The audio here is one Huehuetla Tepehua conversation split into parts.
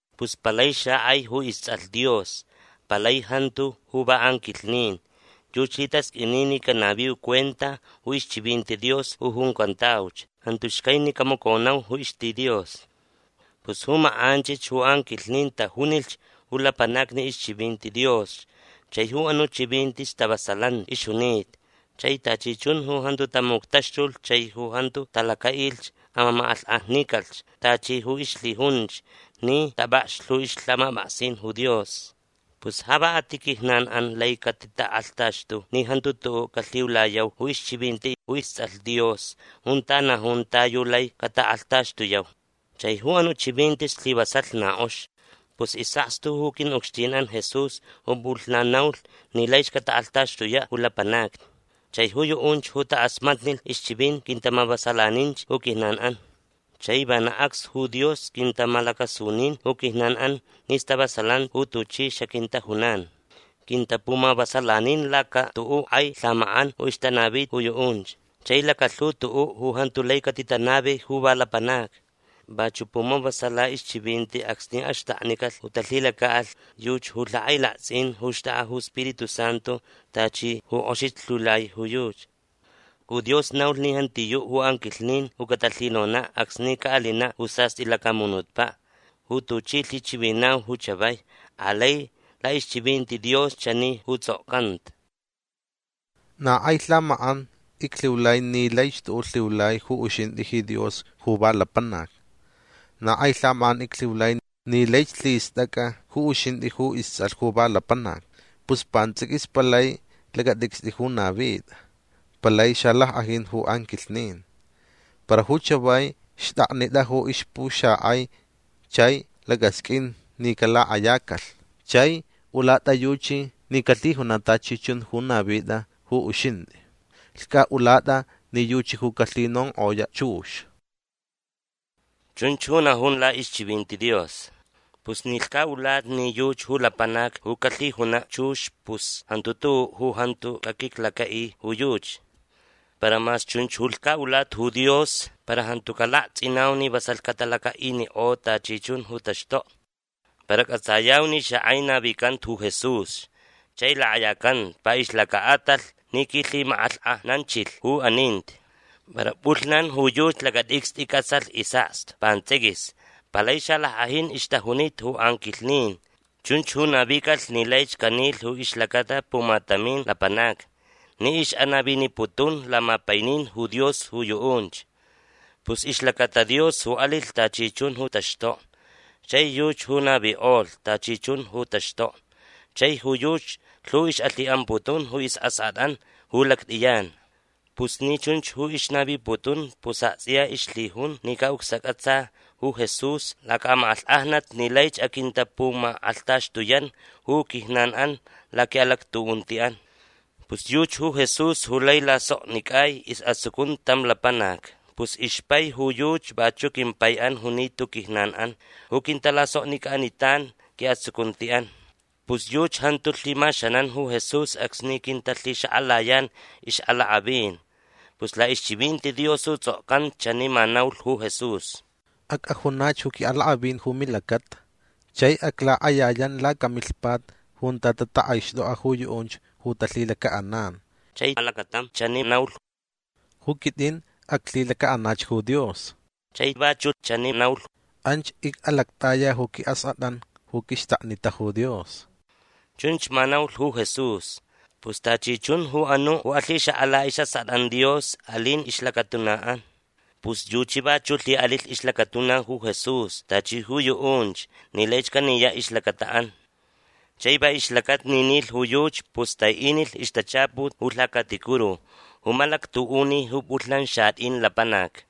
Pus palai xakʼai ju istsʼalh Dios. Palai jantu ju va anquilhnin. Yuchi lhitasqʼuini ni canaviu cuenta ju ixchivinti Dios ju juncantauch. Jantu xcai ni camaconau ju ixti Dios. Pus ju makʼanchich ju anquilhnin tajunilh ju lapanacni ixchivinti Dios. Chai ju anuʼ chivinti stavasalanti ixjunita. Chai tachi chun ju jantu tamuctaxtulh chai ju jantu talacaʼilh amamakʼalhkʼajnicalh tachi ju ixlhijunch ni tapʼakxlh ju ixlhamapʼaksin ju Dios. Pus ja va a ti quijnanʼan lai catitakʼalhtaxtu ni jantu tuʼuʼ calhiulayau ju ixchivinti ju istsʼalh Dios junta najun ta yu lai catakʼalhtaxtuyau. Chai ju anuʼ chivinti slivasalh na kʼox. Pus isʼakstu ju quiʼucxtinʼan Jesús ju pʼulhnan naulh ni laich catatakʼalhtaxtuyaʼ ju lapanacni. Chai ju yuʼunch ju takʼasmatnilh ixchivinti quintamavasalaninch ju quijnanʼan. Chai vana acs ju Dios quintamalacasunin ju quijnanʼan ni stavasalanti ju tuchi xaquintajunan. Quintapumavasalanin laca tuʼuʼ kʼai lhamakʼan ju ixtanavi ju yuʼunch. Chai lacalhu tuʼuʼ ju jantu lai catitanavi ju va lapanacni. Vachuʼ pumavasala ixchivinti acsni axtaknicalh ju talhilacaʼalh yuchi ju lhakʼailaktsʼin ju xtʼakʼa ju Spiritu Santu tachi ju kʼoxich lhiulai ju yuchi. Ju Dios naulh ni jantiyuʼ ju anquilhnin ju catalhinonaʼ acsni caʼalinaʼ ju sastʼi lacamunutpaʼ ju tuchi lhichivinau ju chavai. Alai laʼixchivinti Dios chani ju tsʼokcanta: Na kʼai lhamakʼan iclhiulai ni laich tuʼuʼ lhiulai ju uxintʼi ji Dios ju va lapanac. Na kʼai lhamakʼan iclhiulai ni laich lhistʼacʼa ju uxintʼi ju istsʼalh ju va lapanac. Pus pantsʼiquis palai lacatʼicstʼi ju navitʼa. Palai xalackʼajin ju anquilhnin. Para ju chavai xtʼaknitʼa ju ixpuxakʼai chai lacʼasqʼuin ni calakʼayacalh. Chai ulatʼa yuchi ni calhijunaʼ tachi chun ju navitʼa ju uxintʼi. Lhcʼaʼulatʼa ni yuchi ju calhinonkʼoyaʼ chux. Chunch ju najun laʼixchivinti Dios. Pus ni lhcaʼulata ni yuchi ju lapanac ju calhijunaʼ chux pus jantu tuʼuʼ ju jantu caquiclacaʼi ju yuchi. Para mas chunch ju lhcaʼulata ju Dios para jantucaʼ laktsʼinau ni vasalh catalacaʼinikʼo tachi chun ju taxtokni. Para cʼatsayau ni xakʼai navicanta ju Jesús chai lakʼayacanta va ixlacaʼatalh ni quilhimakʼalhkʼajnanchilh ju aninti. Para pʼulhnan ju yuchi lacatʼicstʼi cʼatsalh isʼakstu pantsʼiquis. Palai xalackʼajin ixtajunita ju anquilhnin. Chunch ju navicalh ni laich canilh ju ixlacata pumatamin lapanacni ni ixʼanaviniputun lamapainin ju Dios ju yuʼunch. Pus ixlacata Dios ju alilh tachi chun ju taxtokni. Chai yuchi ju navikʼolh tachi chun ju taxtokni. Chai ju yuchi lhu ixʼalhiʼamputun ju isʼaskʼatʼan ju lactʼiyan. Pus ni chunch ju ixnaviputun pus aktsʼiya ixlhijun ni caʼucsacʼatsa ju Jesús lacamakʼalhkʼajnat ni laich aquintapumakʼalhtaxtuyan ju quijnanʼan laquiʼalactuʼuntiʼan. Pus yuchi ju Jesús ju lai lasoknicʼai isʼatsucunti tam lapanac. Pus ixpai ju yuchi vachuʼ quimpaiʼan junita ju quijnanʼan ju quintalasoknicʼanitan quiʼatsucuntiʼan. Pus yuchi jantu lhimaxanan ju Jesús acsni quintalhixakʼalayan ixʼalakʼavin. Pus laʼixchivinti Dios ju tsʼokcanta chani ma naulh ju Jesús: Acʼajunach ju quiʼalakʼavin ju milacata. Chai aclakʼayayan lacamilhpat junta tatakʼaixtʼokʼa ju yuʼunch ju talhilacaʼanan. Chai alacatam chani naulh: Ju quitʼin aclhilacaʼanach ju Dios. Chai vachuʼ chani naulh: Anch icʼalactʼaya ju quiʼaskʼatʼan ju quixtaknita ju Dios. Chunch ma naulh ju Jesús. Pus tachi chun ju anuʼ ju alhixakʼala isʼaskʼatʼan Dios alin ixlacatunaʼan. Pus yuchi vachuʼ lhiʼalilh ixlacatuna ju Jesús tachi ju yuʼunch ni laich caniyaʼ ixlacataʼan. Chai va ixlacata ni nilh ju yuchi pus taiʼinilh ixtachaput ju lhacaticuru ju malactuʼuni ju pʼulhnan xatʼin lapanacni.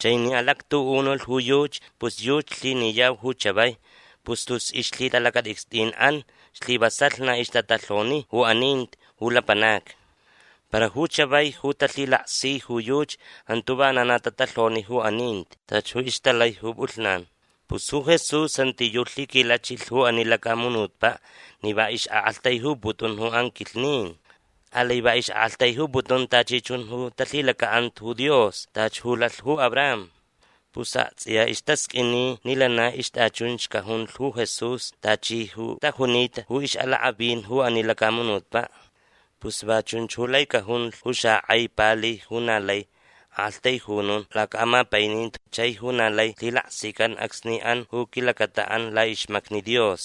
Chai ni alactuʼunulh ju yuchi pus yuchi lhiniyau ju chavai. Pus tus ixlhitalacatʼicstʼinʼan slivasalh na ixtatalhoni ju aninti ju lapanacni. Para ju chavai ju talhilaksi ju yuchi jantu vana na tatalhoni ju aninti tachi ju ixtalai ju pʼulhnan. Pus ju Jesús jantiyuʼ lhiquilachilh ju ani lacamunutpaʼ ni va ixʼaʼaktaijuputun ju anquilhnin. Alai va ixʼaʼaktaijuputun tachi chun ju talhilacaʼanta ju Dios tachi ju lalh ju Abraham. Pus aktsʼiya istasqʼuini ni lana ixtʼachunch cajunlh ju Jesús tachi ju tajunita ju ixʼalakʼavin ju ani lacamunutpaʼ. Pus va chunch ju lai cajunlh ju xakʼai pali ju na lai aʼaktaijunun lacaʼamapaininti chai ju na lai lhilaksican acsni an ju quilacataʼan laʼixmacni Dios.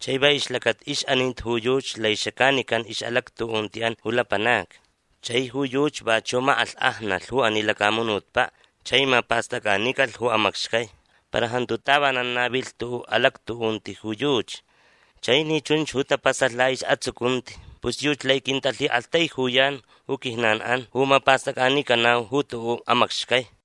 Chai va ixlacata ixʼaninti ju yuchi lai xacanican ixʼalactuʼuntiʼan ju lapanacni. Chai ju yuchi vachuʼ makʼalhkʼajnalh ju ani lacamunutpaʼ chai mapastʼacʼanicalh ju amacxcai. Para jantu tavanan navilh tuʼuʼ alactuʼunti ju yuchi. Chai ni chunch ju tapasalh laʼisʼatsucunti pus yuchi lai quintalhiʼaktaijuyan ju quijnanʼan ju mapastʼacʼanicanau ju tuʼuʼ amacxcai.